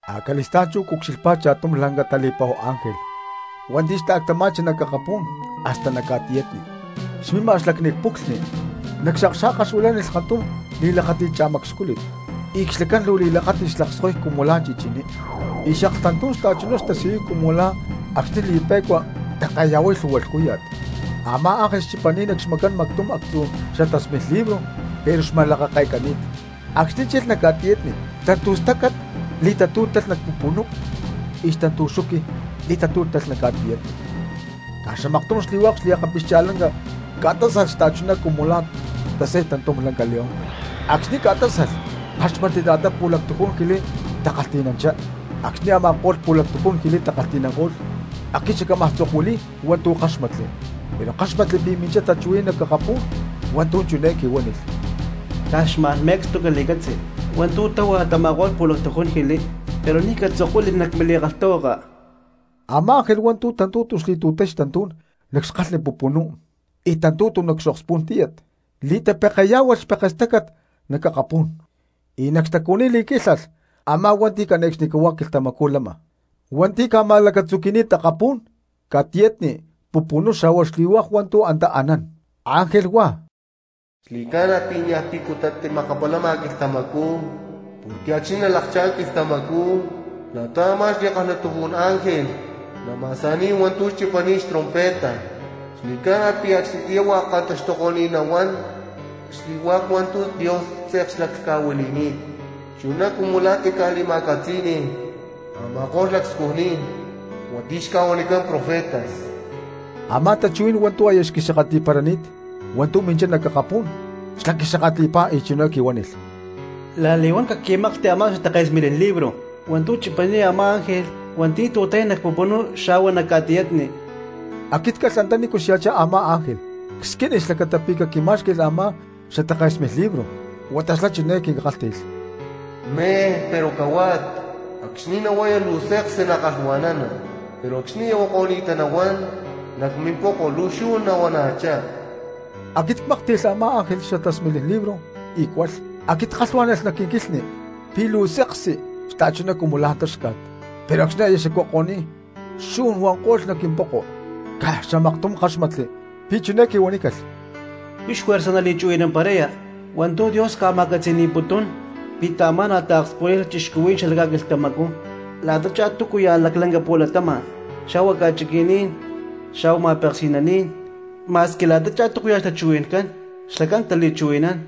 Acali̠stá̠n chú cucxilhpá cha̠tum lanca tali̠pa̠hu ángel hua̠nti̠ xta̠ctama̠chi nac akapú̠n hasta nac ca̠tiyatni, xmima nac xlacni puclhni; nac xakxa̠ka xuilánilh kantum li̠lakáti̠t cha̠macxcúlit y xlacán luu li̠lakáti̠t xlakskoy cumu la̠ chichiní, y xaklhtantú̠n xta̠chuná xtasiyuy cumu la̠ acxni̠ li̠pe̠cua take̠ya̠huay lhu̠hua lhcúya̠t. Amá ángel xchipani̠t nac xmacán mactum actzu̠ xatasmilin libro pero xma̠lakake̠cani̠t. Acxni̠ chilh nac ca̠tiyatni xtantu̠stácat li̠tatú̠talh nac pupunú y xtantu̠xuqui li̠tatú̠talh nac ca̠tiyatni. Caj xamaktum xli̠hua̠k xliakapixcha̠lanca ca̠tásalh xta̠chuná cumu la̠ tasay tantum lanca león; acxni̠ ca̠tásalh ckáxmatli la̠ta pu̠lactujún jili takalhti̠nanchá. Acxni̠ a̠ma̠ko̠lh pu̠lactujún jili takalhti̠nanko̠lh, aquit xacámaj tzokuili̠y hua̠ntu̠ ckáxmatli; pero ckáxmatli pi̠ minchá tachuhuí̠n nac akapú̠n hua̠ntu̠ chiné quihuánilh: —¡Caj xma̠n me̠cstu cali̠catzi hua̠ntu̠ tahua tama̠ko̠lh pu̠lactujún jili, pero ni̠ catzokuili nac mili̠kalhtahuaka! Amá ángel hua̠nti̠ tantu̠tu xli̠tu̠tay xtantú̠n nac xkalhni pupunú y tantu̠tu nac xokspú̠n tíyat, li̠tapekeyá̠hualh xpekestácat nac akapú̠n y nac xtacuhuiní li̠quílhalh a̠má hua̠nti̠ cane̠cxnicahuá quilhtamacú lama, hua̠nti̠ ca̠ma̠lacatzuqui̠ni̠t akapú̠n, ca̠tiyatni, pupunú xa̠hua xli̠hua̠k hua̠ntu̠ antá taanán, ángel huá: —Xli̠ca̠na pi̠ niaj picuta timakapalama quilhtamacú; porque acxni̠ nalakchá̠n quilhtamacú la̠ta a̠má xli̠kalhatujún ángel nama̠sa̠ni̠y hua̠ntu̠ chipani̠t xtrompeta xli̠ca̠na pi̠ acxnitiyá hua̠k kantaxtuko̠ni̠t nahuán xli̠hua̠k hua̠ntu̠ Dios tze̠k xlaclhca̠huili̠ni̠t, chuná cumu la̠ tica̠li̠ma̠catzí̠ni̠lh a̠ma̠ko̠lh xlacscujní̠n hua̠nti̠ xca̠huanicán profetas. Amá tachuhuí̠n hua̠ntu̠ aya xquixakatli̠parani̠t hua̠ntu̠ minchá nac akapú̠n, xlá quixakatli̠pá y chiné quihuánilh: —La̠li̠huán caquí̠maklhti a̠má xatake̠smilin libro hua̠ntu̠ chipani̠t a̠má ángel hua̠nti̠ tu̠tay nac pupunú xa̠hua nac ca̠tiyatni. Aquit calh antanícu xya̠chá a̠má ángel, csquínilh xlacata pi̠ caquimá̠xqui̠lh a̠má xatake̠smilin libro, huata xlá chiné quinkálhti̠lh: —Mej, pero cahuat. Acxni̠ nahuaya luu seksi nakalhua̠nana, pero acxni̠ aya huako̠ni̠ta nahuán, nac mimpoko luu xu̠n nahuana̠chá. Aquit cmáklhti̠lh a̠má ángel xatake̠smilin libro y cualh; aquit ckalhuá̠nalh nac quinquilhni pi̠ luu seksi xta̠chuná cumu táxca̠t, pero acxni̠ aya xacuako̠ni̠t xu̠n huanko̠lh nac quimpoko. Caj xamaktum ckáxmatli pi̠ chiné quihuanícalh: —Huix juerza nali̠chuhui̠namparaya hua̠ntu̠ Dios ca̠ma̠catzi̠ni̠putún pi̠ taamá̠nalh taokspulay cristianos xala ca̠quilhtamacú la̠tachá túcuya̠ laclanca pu̠latama̠n, xa̠hua ca̠chiqui̠ní̠n, xa̠hua ma̠peksi̠naní̠n, ma̠squi la̠tachá túcuya̠ xtachuhui̠ncán xlacán tali̠chuhui̠nán.